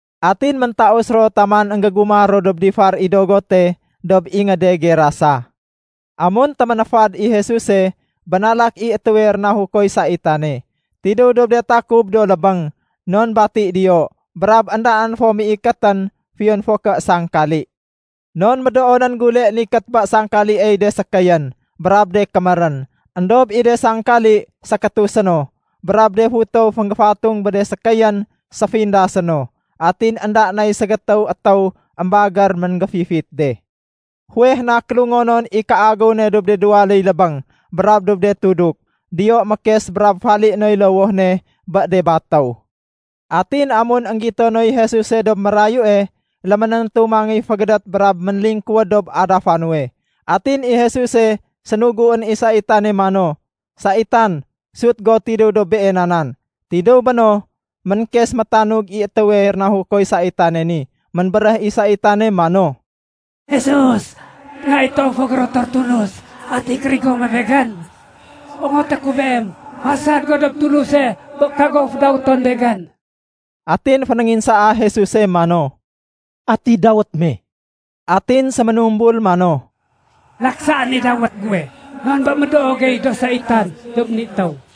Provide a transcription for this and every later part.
Atin méntaus ro taman énggégumah ro dob difar i dogote, dob ingéde Gerasa. Amun téménéfad i Jesuse, bénalak i étéwe rénahukoy saitane. Tidéw dob de takub do lébéng, non bati diyo. Brab éndaén fo méikétén, fiyon fo ké sangkali. Non médoonén gule nikét bé sangkaliey de sékéyén brab de kémérén. Endob i de sangkali sékétusé no, brab de futow fénggéfatung bé de sékéyén séfindasé no. Atin énda nay ségétéw étéw émbagér ménggéfifit de. Fuweh na kélungonon i kéagéw ne dob de duwaléy lébéng brab dob de tuduk. Diyo mékes brab falié noy lowoh ne bé de batéw. Atin amun énggito noy Jesuse dob mérayue, léménéntu mangéy fégédét brab ménlingkuwéd dob adafa nuwe. Atin i Jesuse sénuguén i saitane mano, “Saitan, sut go tidéw dob beena nan!” Tidéw béno, ménkes métanug i étéwe rénahukoy saitane ni. Ménbéréh i saitane mano, “Jesus, Nga i toowe fo gérotor Tulus, ati kérigo muwe begén? Ongoté ku Beem, fasad go dob Tuluse bé kago fédawéton begén.” Atin fénénginsaa Jesuse mano, “Ati dawét me?” Atin séménumbul mano, “Laksaén i dawét guwe non bé médoo gey do saitan dob ni étéw.”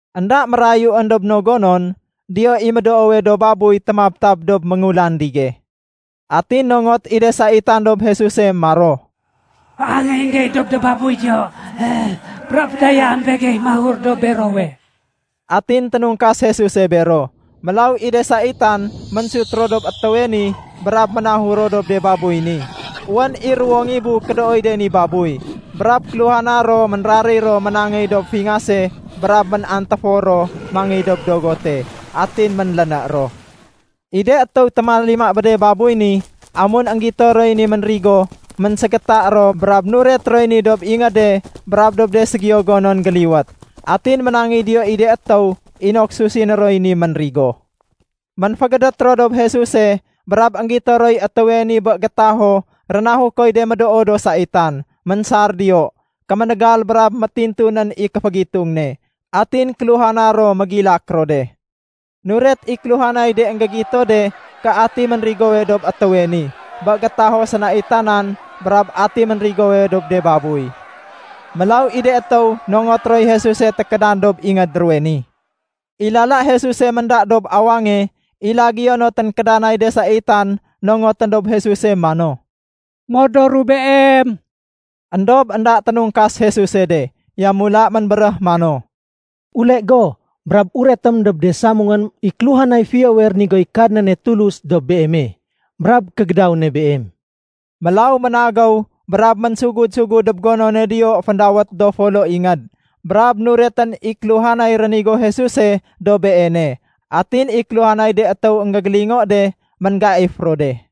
Enda mérayuén dob no gonon, diyo i médoowe do babuy témabtab dob méngulandige. Atin nongot i de saitan dob Jesuse maro, “féangéyén gey dob do babuy diyo, brab fédayaém begey mahur dob berowe.” Atin ténungkas Jesuse bero. Mélaw i de saitan ménsut ro dob étéwe ni brab ménahur ro dob de babuy ni. Wén i ruwo ngibu kédooy de ni babuy, brab kéluhana ro ménraréy ro ménangéy dob fingase brab ménantéfor ro mangéy dob dogote, atin ménléné ro. I de étéw témalima bé de babuy ni, amun énggito roy ni ménrigo, ménségéta ro brab nuret roy ni dob ingéde brab dob de ségiyo gonon géliwét. Atin ménangéy diyo i de étéw inok susiné roy ni ménrigo. Ménfégédét ro dob Jesuse brab énggito roy étéwe ni bé gétaho rénahukoy de médoo do saitan. Ménsar diyo, kéménégal brab métintunén i kéfégitung ne. Atin kéluhana ro mégilak ro de. Nuret i kéluhanay de énggégito de ké ati ménrigowe dob étéwe ni bé gétaho sénaitanan brab ati ménrigowe dob de babuy. Mélaw i de étéw nongot roy Jesuse tékédan dob ingéd ruwe ni. I lala Jesuse ménda dob awange, i lagéyo no ténkédanay de saitan nongotén dob Jesuse mano, “Modoru Beem.” Endob énda ténungkas Jesuse de. Yamula ménbéréh mano, “Ule go brab uretém dob de samungém i kéluhanay fiyowe rénigoy Kadnane Tulus dob beeme brab kégédaw ne beem.” Mélaw ménagéw brab ménsugud-sugud dob gonone diyo féndawét “Do Folo Ingéd”, brab nuretén i kéluhanay rénigo Jesuse dob beene. Atin i kéluhanay de étéw énggégélingo de, ménggaif ro de.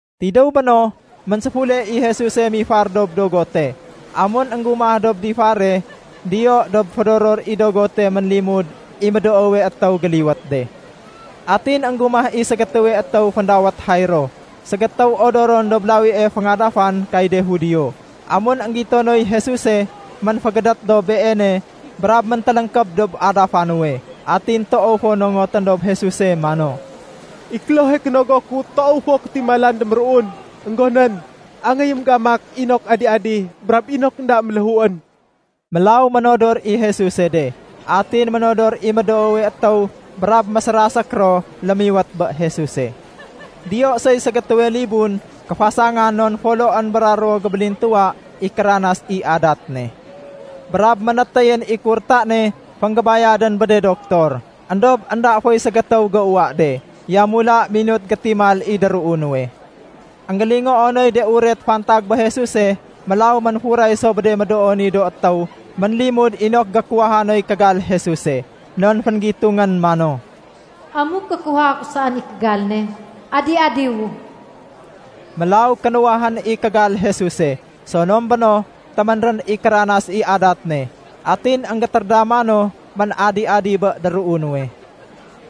Tidéw béno, ménséfule i Jesuse mifar dob dogote. Amun énggumah dob difare, diyo dob fédoror i dogote ménlimud i médoowe étéw géliwét de. Atin énggumah i ségétéwe étéw féndawét Jairo, ségétéw odoron dob lawie féngadafan kay de Judio. Amun énggito noy Jesuse, ménfégédét dob Beene brab méntéléngkéb dob adafa nuwe. Atin toow fo nongotén dob Jesuse mano, “I klohe kénogo ku toow fo kétimalan déméruun. Enggonén angéyém gamak inok adi-adi brab inok énda méléhuén.” Mélaw ménodor i Jesuse de. Atin ménodor i médoowe étéw brab mésérasék ro lémiwét bé Jesuse. Diyo soy ségétéwe libun kéfasangan non foloén bra ruwo gébélintuwa i kéranas i adat ne. Brab ménétéyén i kurta ne fénggébayadén bé de doktor, éndob énda foy ségétéw géuwa de. Yamula minut gétimal i déruu nuwe. Enggélingoo noy de uret fantag bé Jesuse, mélaw ménfuray so bé de médoo ni do étéw ménlimud inok gékuwaha noy kégal Jesuse. Non fénggitungén mano, “Amuk gékuwaha ku saén i kégal ne, adi-adiwu.” Mélaw kénuwahén i kégal Jesuse. Sonom béno, téménrén i kéranas i adat ne, atin énggétérédama no ménadi-adi bé déruu nuwe.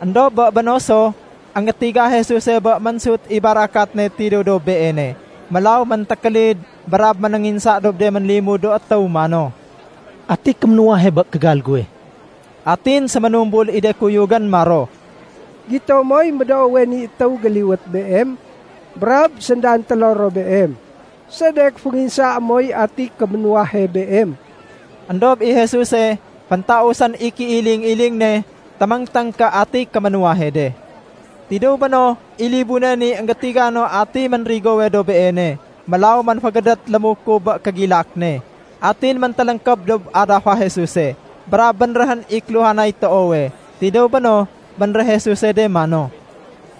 Endob bé béno so, énggétiga Jesuse bé ménsut i barakat ne tidéw dob Beene. Mélaw méntékélid brab ménénginsa dob de ménlimud do étéw mano, “Ati kéménuwahe bé kégal guwe?” Atin séménumbul i de kuyugén maro, “Gito moy médoowe ni étéw géliwét Beem brab séndantélo ro Beem. Sedek fénginsaé moy ati kéménuwahe Beem?” Endob i Jesuse féntausén i kéiling-iling ne téméngténg ké atiy kéménuwahe de. Tidéw béno, i libune ni énggétiga no atiy ménrigowe dob beene. Mélaw ménfégédét lémukub bé kégilak ne, atin méntéléngkéb dob adafa Jesuse. Brab bénréhén i kéluhanay toowe. Tidéw béno, bénréh Jesuse de mano,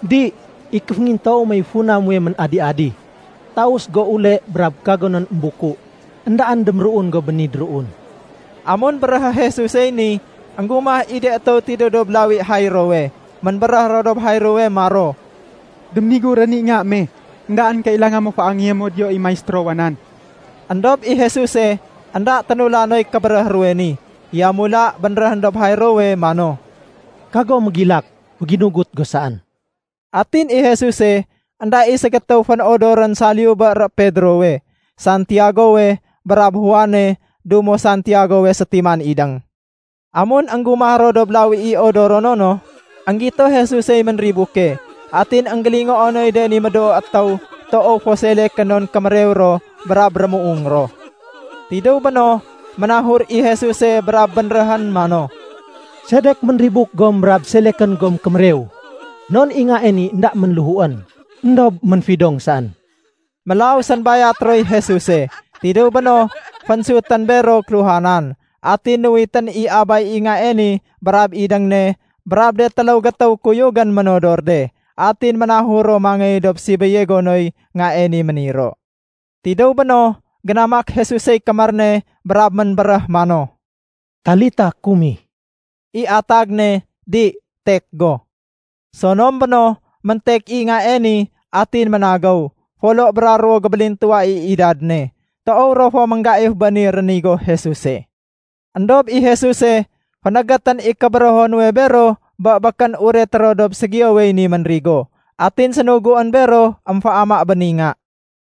“Di, i kéféngintoow mey funa muwe ménadi-adi. Taus go ule brab kagonén émbuku. Endaén déméruun go bé ni déruun.” Amun béréhé Jesusey ni, énggumah i de étéw tidéw dob lawi Jairowe. Ménbéréh ro dob Jairowe maro, “Déménigurén i nga me. Endaén kailanga mo féangéyé mo diyo i Maistérowa nan.” Endob i Jesuse, énda ténula noy kébéréh ruwe ni, yamula bénréhén dob Jairowe mano, “Kago mégilak. Féginugut go saén.” Atin i Jesuse, énda i ségétéw fénodorén saliyu bé ro Pedrowe, Santiagowe, brab Juane dumo Santiagowe sétiman idéng. Amun énggumah ro dob lawi i odorono no, énggito Jesusey ménribuke, atin énggélingoo noy de ni médoo étéw toow fo selekén non kémérew ro brab rémuung ro. Tidéw béno, ménahur i Jesuse brab bénréhén mano, “Sedek ménribuk gom brab selekén gom kémérew? Non i ngae ni énda ménléhuén, éndob ménfidong saén.” Mélaw sénbayat roy Jesuse. Tidéw béno fénsutén bero kéluhanan, atin nuwitén i abay i ngae ni brab idéng ne brab de téléw gétéw kuyugén ménodor de, atin ménahur ro mangéy dob sibéye gonoy ngae ni méniro. Tidéw béno, génamak Jesusey kémér ne brab ménbéréh mano, “Talita kumi.” (I atag ne “Di, tek go!”) Sonom béno, méntek i ngae ni atin ménagéw. Folo bra ruwo gébélintuwa i idad ne. Toow ro fo ménggaif bé ni rénigo Jesuse. Endob i Jesuse fénégétén i kébérého nuwe bero bé békén ureté ro dob ségiyowey ni ménrigo. Atin sénuguén bero émféama bé ni nga.